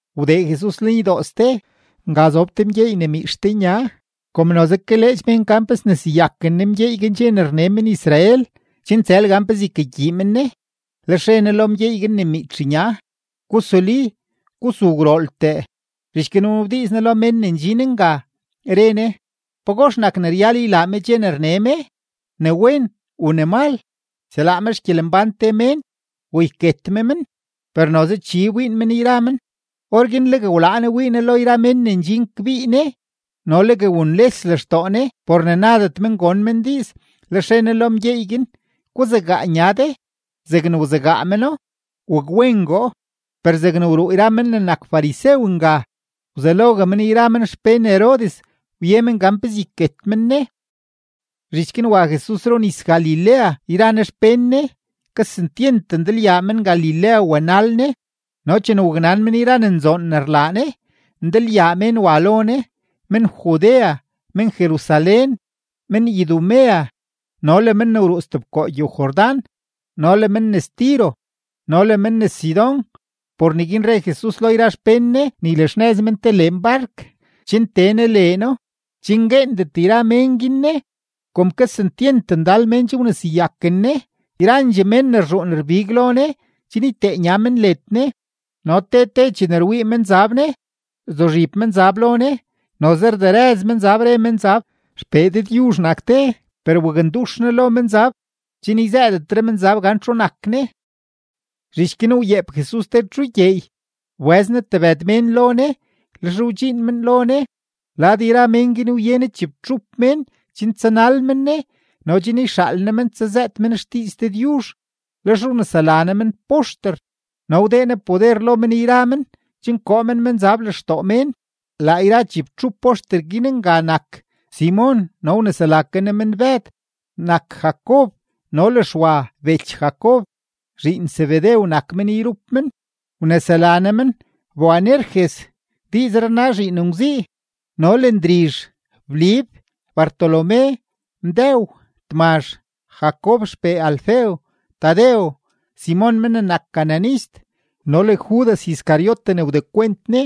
Wdee Jesus lenydoo ste; nga zob te mgyeey ne miitx te nya. Kom noze kaleedx mén gan pe sneseyaken Ne mgyeey guin dxe ne rne men-Israel, chen tsël gan pezee ykagyii men Ne. Lex re Ne lo mgyeey guin ne miitx nya: ―Gusuli, gusu gwrooltee. Zhich guin wnabdiiz Ne lo mén ne ndxin nga, re Ne: ―¿Pagox nak ne ryal ylaa me dxe ne rne me, ne wen u ne mal?, ¿yselaa me xgyelembán te mén u yket me men? Per noze chi wbiin men yra men. Orguin legue wlaa Ne wii Ne lo yra mén ne ndxin kbii Ne no legue wunles lextoo Ne por ne nadet men gon men diiz. Lex re Ne lo mgyeey guin: ―Guzegaa nya de. Zegne wzegaa meno, wakwengoo. Per zegne wruu yra men ne nak farisew nga, wzelogue men yra men xpén Herodes wye men gan pezee yket men Ne. Zhich guin wa Jesus runis-Galilea yra Ne xpén Ne; kesentyent ndalyaa men-Galilea wanal Ne. No chene waknan mén yra ne nzoon ne rlaa Ne, ndalyaa mén wa lo Ne: men-Judea, men-Jerusalén, men-Idumea, no le men ne wruu stebkoo gyow-Jordán, no le men nes Tiro, no le men nes Sidón. Por neguin re Jesus lo xpén Ne ne ylaxnëz men te leen bark chen tee Ne leeno, chen gueendet yra mén guin Ne. Kom kesentyent ndal mén che wneseyaken Ne, yrandxee mén ne rzhuun rbig lo Ne chen ytee nya men led Ne. No te te chene rwii menzab Ne, rzuzhib menzab lo Ne, noze rderëz menzab, re menzab: ―¡XPee Dëdyuzh nak de! Per waknduxyaa Ne lo menzab chen yzëëdetre menzab gan txu nak Ne. Zhich guin wyeep Jesus te txu gyeey, wbëz Ne tebëd mén lo Ne, lex wdxiin men lo Ne. Lad yra men guin wye Ne chibtxup mén chen tsanal men Ne no chen yxaal Ne men tsazëët men xdiiz Dëdyuzh, lex wnesela Ne men poxter no wdee Ne poder lo men yra men chen koo men menzab lextoo mén. Laa yra chibtxup poxter guin nga nak: Simon no wnesela ke Ne men Bëd, nak Jacob no le Xwa bech Jacob, zhiin Zebedew nak men yrup men, wnesela Ne men Boanerges (diizree rna Zhiin Ngwzii), no le Ndrizh, Blib, Bartolomé, Mdëw, Tmazh, Jacob xpee Alfeo, Tadeo, Simon men ne nak cananist, no le Judas Iscariote ne wdekwent Ne.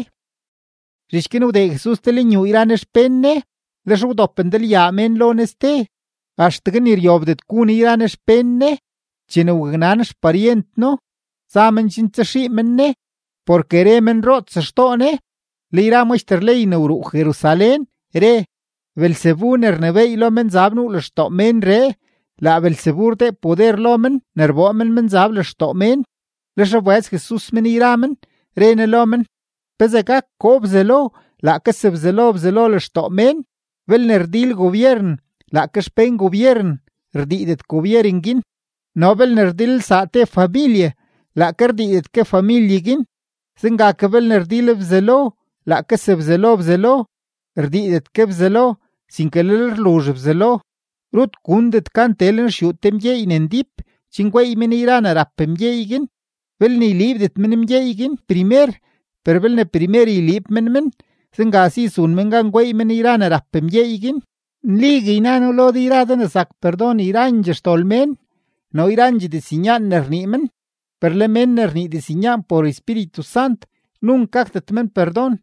Zhich guin wdee Jesus te lenyuu yra Ne xpén Ne, lex wdop ndalyaa mén lo Ne ste, axtegue ni ryobdet gu Ne yra Ne xpén Ne. Chene waknan xparyent No, za men chen tsaxii men Ne, porke re men roots xtoo Ne. Le yra maxter ley ne wruu Jerusalén re: ―Beelzebu ne rnebééy lo menzab nuu lextoo ménree, laa Beelzebu rdee poder lo men ne rboo men menzab lextoo mén. Lex wbëz Jesus men yra men, re Ne lo men: ―¿Pezee gak koo Bzelo laake sebzelo Bzelo lextoo mén? Belne rdil gobyeren laake xpén gobyeren, rdiidet gobyeren guin. No belne rdilelsaa te familye, laake rdiidet ke familye guin. Zenga ke, belne rdil Bzelo laake sebzelo Bzelo, ydiidet ke Bzelo, sinke lel luzh Bzelo. ’Rut gundet gan tee lenxyuu te mgyeey ne ndíp chen gweey men yra ne rap mgyeey guin, belne yliibdet men mgyeey guin primer. Per belne primer yliib men men, zenga si zun men gan gweey men yra ne rap mgyeey guin. ’Nligue yna noo lo de yra de ne zak perdon yrandxee xdol mén no yrandxee diznyaan ne rnii men. Per le men ne rnii diznyaan por Espíritu Sant, nunk gakdet men perdon,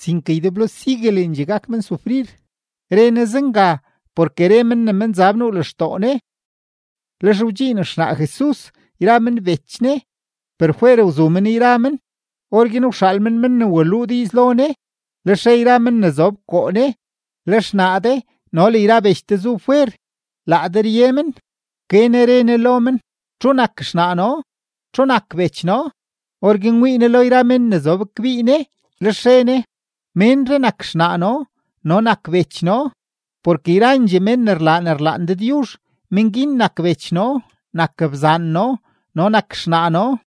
sinke ydeblo siguelendxee gak men sufrir. Re Ne zenga porke re men ne menzab nuu lextoo Ne. Lex wdxiin xnaa Jesus yra men bech Ne, per fwer wzu men yra men; orguin wxaal men men ne waluu diiz lo Ne. Lex re yra men ne zob koo Ne: ―Le xnaa de no le yra bech de zu fwer, laa de rye men. Wke Ne re Ne lo men: ―¿Txu nak xnaa noo? ¿Txu nak bech noo? Orguin wii Ne lo yra mén ne zob kbii Ne, lex re Ne: ―Ménree nak xnaa noo no nak bech noo. Porke yrandxee mén ne rlaa ne rlaan Dëdyuzh, mén guin nak bech noo, nak bzaan noo no nak xnaa noo.